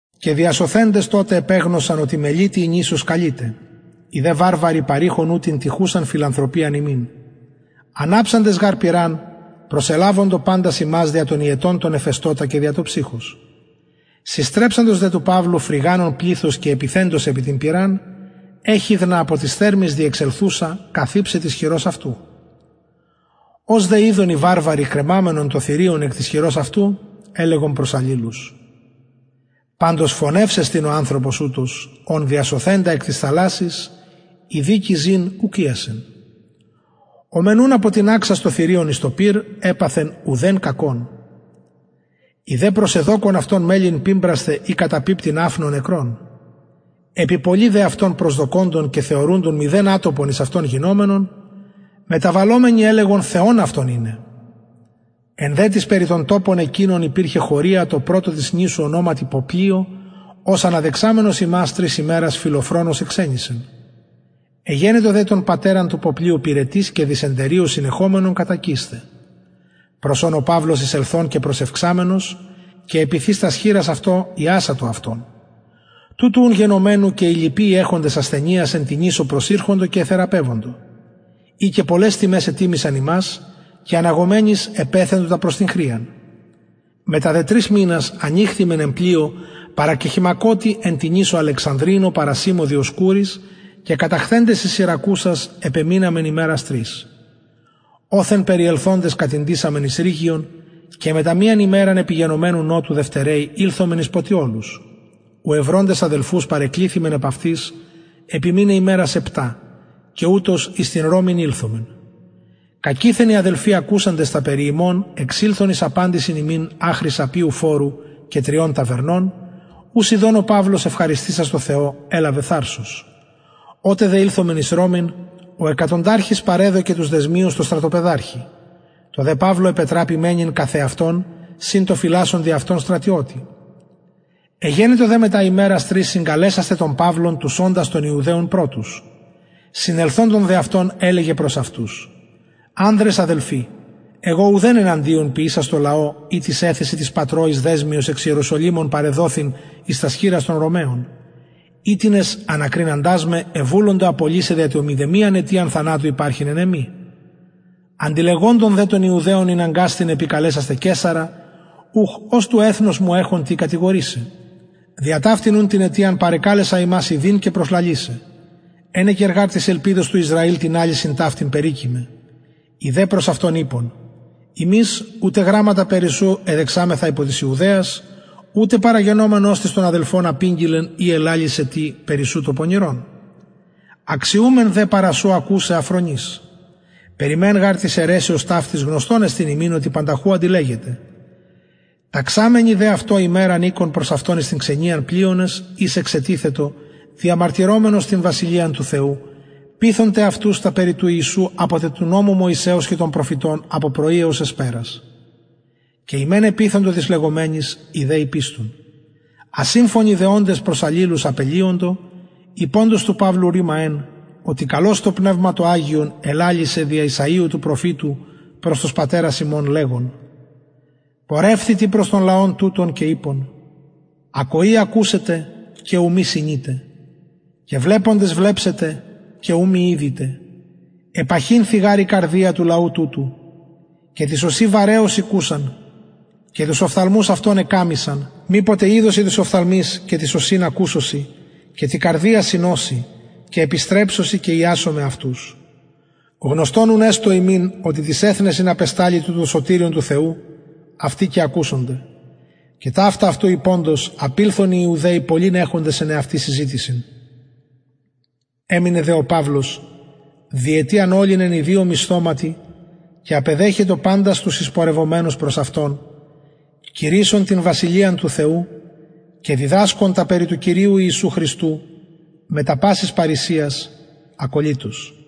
και διασωθεντες τοτε επεγνωσαν οτι μελιτη η νησος καλειται οι δε βαρβαροι παρειχον ου την τυχουσαν φιλανθρωπιαν ημιν αναψαντες γαρ πυραν προσελαβοντο παντας ημας δια τον υετον τον εφεστωτα και δια το ψυχος συστρεψαντος δε του παυλου φρυγανων πληθος και επιθεντος επι την πυραν εχιδνα εκ της θερμης διεξελθουσα καθηψεν της χειρος αυτου ως δε ειδον οι βαρβαροι κρεμαμενον το θηριον εκ της χειρος αυτου ελεγον προς αλληλους παντως φονευς εστιν ο ανθρωπος ουτος ον διασωθεντα εκ της θαλασσης η δικη ζην ουκ ειασεν ο μεν ουν αποτιναξας το θηριον εις το πυρ επαθεν ουδεν κακον οι δε προσεδοκων αυτον μελλειν πιμπρασθαι η καταπιπτειν αφνω νεκρον επι πολυ δε αυτων προσδοκωντων και θεωρουντων μηδεν ατοπον εις αυτον γινομενον μεταβαλλομενοι ελεγον θεον αυτον ειναι εν δε τοις περι τον τοπον εκεινον υπηρχεν χωρια τω πρωτω της νησου ονοματι ποπλιω ος αναδεξαμενος ημας τρεις ημερας φιλοφρονως εξενισεν εγενετο δε τον πατερα του ποπλιου πυρετοις και δυσεντερια συνεχομενον κατακεισθαι προς ον ο παυλος εισελθων και προσευξαμενος επιθεις τας χειρας αυτω ιασατο αυτον τουτου ουν γενομενου και οι λοιποι οι εχοντες ασθενειας εν τη νησω προσηρχοντο και εθεραπευοντο οι και πολλαις τιμαις ετιμησαν ημας και αναγομενοις επεθεντο τα προς την χρειαν μετα δε τρεις μηνας ηχθημεν εν πλοιω παρακεχειμακοτι εν τη νησω αλεξανδρινω παρασημω διοσκουροις και καταχθεντες εις συρακουσας επεμειναμεν ημερας τρεις οθεν περιελθοντες κατηντησαμεν εις ρηγιον και μετα μιαν ημεραν επιγενομενου νοτου δευτεραιοι ηλθομεν εις ποτιολους ου ευροντες αδελφους παρεκληθημεν επ αυτοις επιμειναι ημερας επτα και ουτως εις την ρωμην ηλθομεν κακειθεν οι αδελφοι ακουσαντες τα περι ημων εξηλθον εις απαντησιν ημιν αχρι αππιου φορου και τριων ταβερνων ους ιδων ο παυλος ευχαριστησας τω θεω ελαβεν θαρσος οτε δε ηλθομεν εις ρωμην ο εκατονταρχος παρεδωκεν τους δεσμιους τω στρατοπεδαρχη τω δε παυλω επετραπη μενειν καθ εαυτον συν τω φυλασσοντι αυτον στρατιωτη εγενετο δε μετα ημερας τρεις συγκαλεσασθαι τον παυλον τους οντας των ιουδαιων πρωτους συνελθοντων δε αυτων ελεγεν προς αυτους ανδρες αδελφοι εγω ουδεν εναντιον ποιησας τω λαω η τοις εθεσιν τοις πατρωοις δεσμιος εξ ιεροσολυμων παρεδοθην εις τας χειρας των ρωμαιων οιτινες ανακριναντες με εβουλοντο απολυσαι δια το μηδεμιαν αιτιαν θανατου υπαρχειν εν εμοι αντιλεγοντων δε των ιουδαιων ηναγκασθην επικαλεσασθαι καισαρα ουχ ως του εθνους μου εχων τι κατηγορησαι δια ταυτην ουν την αιτιαν παρεκαλεσα υμας ιδειν και προσλαλησαι ενεκεν γαρ της ελπιδος του ισραηλ την αλυσιν ταυτην περικειμαι οι δε προς αυτον ειπον ημεις ουτε γραμματα περι σου εδεξαμεθα απο της ιουδαιας ουτε παραγενομενος τις των αδελφων απηγγειλεν η ελαλησεν τι περι σου πονηρον αξιουμεν δε παρα σου ακουσαι α φρονεις περι μεν γαρ της αιρεσεως ταυτης γνωστον εστιν ημιν οτι πανταχου αντιλεγεται ταξαμενοι δε αυτω ημεραν ηκον προς αυτον εις την ξενιαν πλειονες οις εξετιθετο διαμαρτυρομενος την βασιλειαν του θεου πειθων τε αυτους τα περι του ιησου απο τε του νομου μωυσεως και των προφητων απο πρωι εως εσπερας και οι μεν επειθοντο τοις λεγομενοις οι δε ηπιστουν ασυμφωνοι δε οντες προς αλληλους απελυοντο ειποντος του παυλου ρημα εν οτι καλως το πνευμα το αγιον ελαλησεν δια ησαιου του προφητου προς τους πατερας ημων λεγον πορευθητι προς τον λαον τουτον και ειπον ακοη ακουσετε και ου μη συνητε και βλεποντες βλεψετε και ου μη ιδητε επαχυνθη γαρ η καρδια του λαου τουτου και τοις ωσιν βαρεως ηκουσαν και τους οφθαλμους αυτων εκαμμυσαν μηποτε ιδωσιν τοις οφθαλμοις και τοις ωσιν ακουσωσιν και τη καρδια συνωσιν και επιστρεψωσιν και ιασομαι αυτους γνωστον ουν εστω υμιν οτι τοις εθνεσιν απεσταλη το σωτηριον του θεου αυτοι και ακουσονται και ταυτα αυτου ειποντος απηλθον οι ιουδαιοι πολλην εχοντες εν εαυτοις συζητησιν εμεινεν δε ο παυλος διετιαν ολην εν ιδιω μισθωματι και απεδεχετο παντας τους εισπορευομενους προς αυτον κηρυσσων την βασιλειαν του θεου και διδασκων τα περι του κυριου ιησου χριστου μετα πασης παρρησιας ακωλυτως